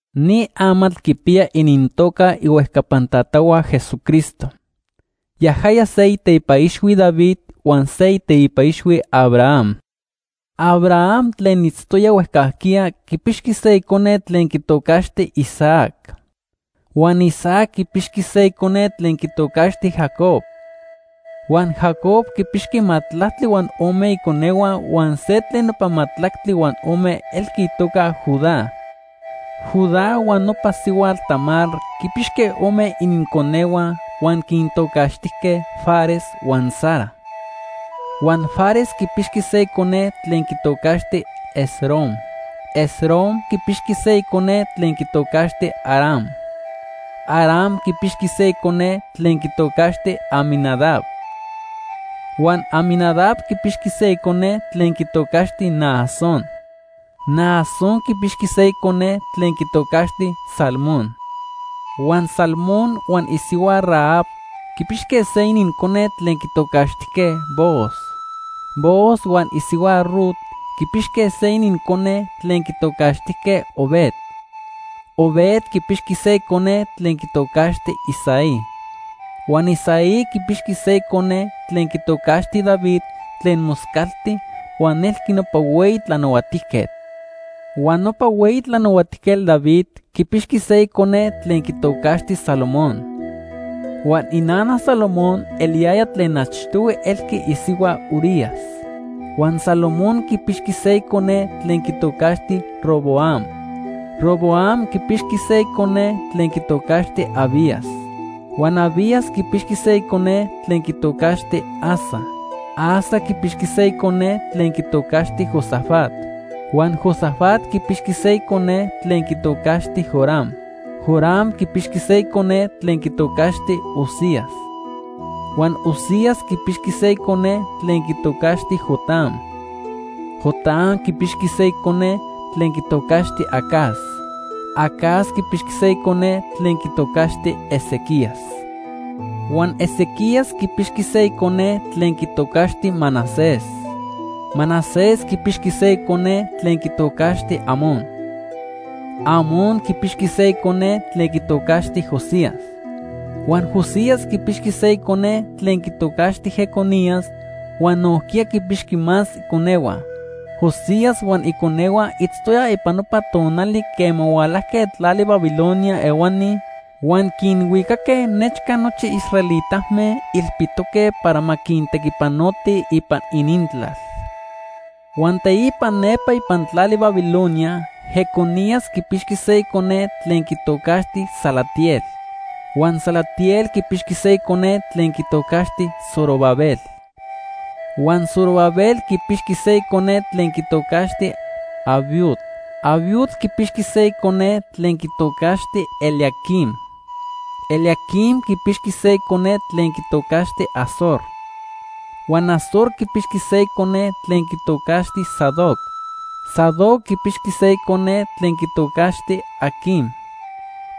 Ni amatl quipiya inintoca ihuejcapan tatahua Jesucristo. Yajaya se iteipa ixhui David huan se iteipa ixhui Abraham. Abraham tlen itztoya huejcajquiya quipixqui se icone tlen quitocaxti Isaac. Huan Isaac quipixqui se icone tlen quitocaxti Jacob. Huan Jacob quinpixqui majtlactli huan ome iconehua huan se tlen nopa majtlactli huan ome elqui itoca Judá. Judá huan nopa sihuatl Tamar quinpixque ome ininconehua huan quintocaxtijque Fares huan Zara. Huan Fares quipixqui se icone tlen quitocaxti Esrom. Esrom quipixqui se icone tlen quitocaxti Aram. Aram quipixqui se icone tlen quitocaxti Aminadab. Huan Aminadab quipixqui se icone tlen quitocaxti Naasón. Naasón quipixqui se icone tlen quitocaxti Salmón. Huan Salmón huan isihua Rahab quipixque se inincone tlen quitocaxtijque Booz. Booz huan isihua Rut quipixque se inincone tlen quitocaxtijque Obed. Obed quipixqui se icone tlen quitocaxti Isaí. Huan Isaí quipixqui se icone tlen quitocaxti David tlen moscalti huan elqui nopa hueyi tlanahuatijquetl. Huan nopa hueyi tlanahuatijquetl David quipixqui se icone tlen quitocaxti Salomón. Huan inana Salomón eliyaya tlen achtohui elqui isihua Urías. Huan Salomón quipixqui se icone tlen quitocaxti Roboam. Roboam quipixqui se icone tlen quitocaxti Abías. Huan Abías quipixqui se icone tlen quitocaxti Asa. Asa quipixqui se icone tlen quitocaxti Josafat. Huan Josafat quipixqui se icone tlen quitocaxti Joram. Joram quipixqui se icone tlen quitocaxti Uzías. Huan Uzías quipixqui se icone tlen quitocaxti Jotam. Jotam quipixqui se icone tlen quitocaxti Acaz. Acaz quipixqui se icone tlen quitocaxti Ezequías. Huan Ezequías quipixqui se icone tlen quitocaxti Manasés. Manasés quipixqui se icone tlen quitocaxti Amón. Amón quipixqui se icone tlen quitocaxti Josías. Huan Josías quipixqui se icone tlen quitocaxti Jeconías huan nojquiya quinpixqui más iconehua. Josías huan iconehua itztoyaj ipan nopa tonali quema hualajque tlali Babilonia ehuani huan quinhuicaque nechca nochi israelitame ilpitoque para ma quintequipanotij ipan inintlal. Huan teipa nepa ipan tlali Babilonia Jeconías quipixqui se icone tlen quitocaxti Salatiel. Huan Salatiel quipixqui se icone tlen quitocaxti Zorobabel. Huan Zorobabel quipixqui se icone tlen quitocaxti Abiud. Abiud quipixqui se icone tlen quitocaxti Eliaquim. Eliaquim quipixqui se icone tlen quitocaxti Azor. Huan Azor quipixqui se icone tlen quitocaxti Sadoc. Sadoc quipixqui se icone tlen quitocaxti Aquim.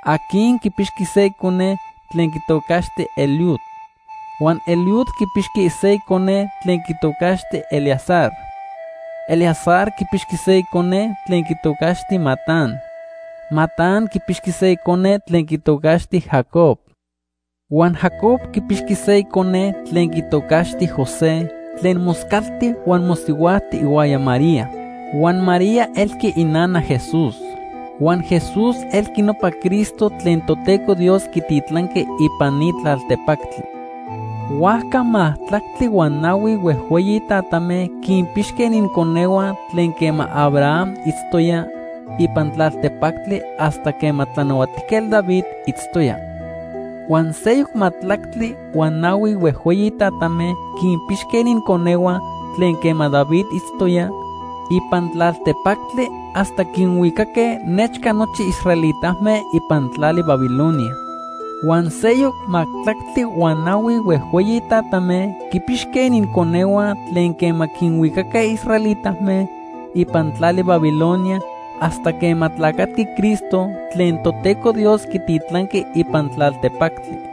Aquim quipixqui se icone tlen quitocaxti Eliud. Huan Eliud quipixqui se icone tlen quitocaxti Eleazar. Eleazar quipixqui se icone tlen quitocaxti Matán. Matán quipixqui se icone tlen quitocaxti Jacob. Huan Jacob quipixqui se icone tlen quitocaxti José tlen moscalti huan mosihuajti ihuaya María. Huan María elqui inana Jesús. Huan Jesús elqui nopa Cristo tlen Toteco Dios quititlanqui ipan ni tlaltepactli. Huajca majtlactli huan nahui huejhueyi tatame quinpixque ininconehua tlen quema Abraham itztoya ipan tlaltepactli hasta quema Tlanahuatijquetl David itztoya. Huan seyoc majtlactli huan nahui huejhueyi tatame quinpixque ininconehua tlen quema David itztoya ipan tlaltepactli hasta quinhuicaque nechca nochi israelitame ipan tlali Babilonia. Huan seyoc majtlactli huan nahui huejhueyi tatame quinpixque ininconehua tlen quema quinhuicaque israelitame ipan tlali Babilonia hasta quema tlacatqui Cristo tlen Toteco Dios quititlanqui ipan tlaltepactli.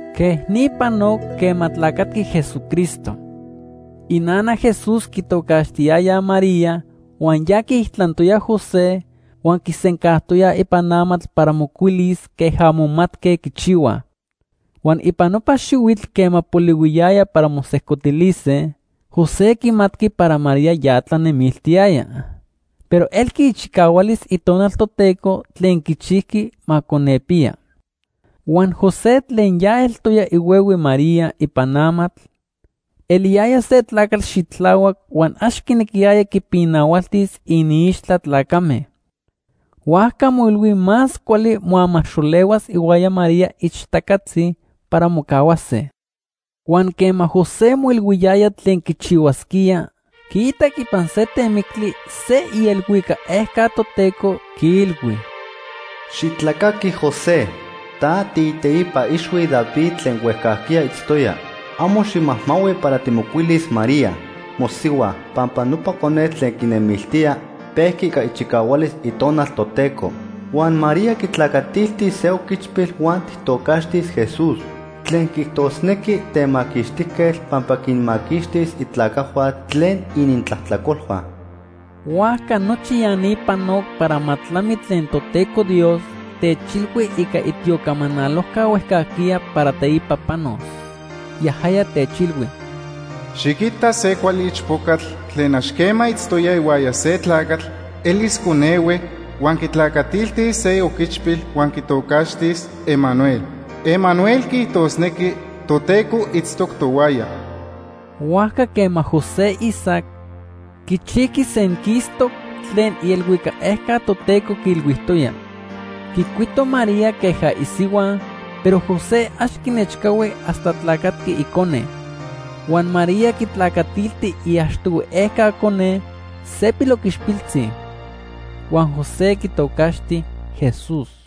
Quej ni panoc quema tlacatqui Jesucristo. Inana Jesús quitocaxtiyayaj María huan ya quiijtlantoya José huan quisencajtoyaj ipan amatl para mocuilis queja momatque quichihuaj. Huan ipan nopa xihuitl quema polihuiyaya para mosejcotilise, José quimatqui para María ya tlanemiltiyaya, pero elqui ichicahualis Itonal Toteco tlen quichijqui ma conepiya. Huan José, tlen ya eltoya ihuehue María ipan amatl, eliyaya se tlacatl xitlahuac huan ax quinequiyaya quipinahualtis iniixtla tlacame. Huajca moilhui más cuali moamaxolehuas ihuaya María ixtacatzi para mocahuase. Huan quema José moilhuiyaya tlen quichihuasquía, quiitac ipan se temictli se ielhuicac ejca Toteco quiilhui: “Xitlacaqui José, ta tiiteipa ixhui David tlen huejcajquiya itztoya. Amo ximajmahui para timocuilis María, mosihua, pampa nopa conetl tlen quinemiltía, pejqui ica ichicahualis Itonal Toteco. Huan María quitlacatiltis se oquichpil huan tijtocaxtis: ‘Jesús’ tlen quiijtosnequi Temaquixtijquetl pampa quinmaquixtis itlacajhua tlen inintlajtlacolhua.” Huajca nochi ya ni panoc para ma tlami tlen Toteco Dios techilhui ica itiocamanalojca huejcajquiya para teipa panos. Yajaya techilhui: “Xiquita se cuali ichpocatl tlen ax quema itztoya ihuaya se tlacatl elis conehue, huan quitlacatiltis se oquichpil huan quitocaxtis: Emanuel. Emanuel quiijtosnequi: ‘Toteco itztoc tohuaya.’” Huajca quema José isac, quichijqui senquistoc tlen ielhuicac ejca Toteco quiilhuijtoya. Quicuito María queja isihua, pero José ax quinechcahui hasta tlacatqui icone. Huan María quitlacatilti iachtohui ejca cone, se piloquichpiltzi. Huan José quitocaxti Jesús.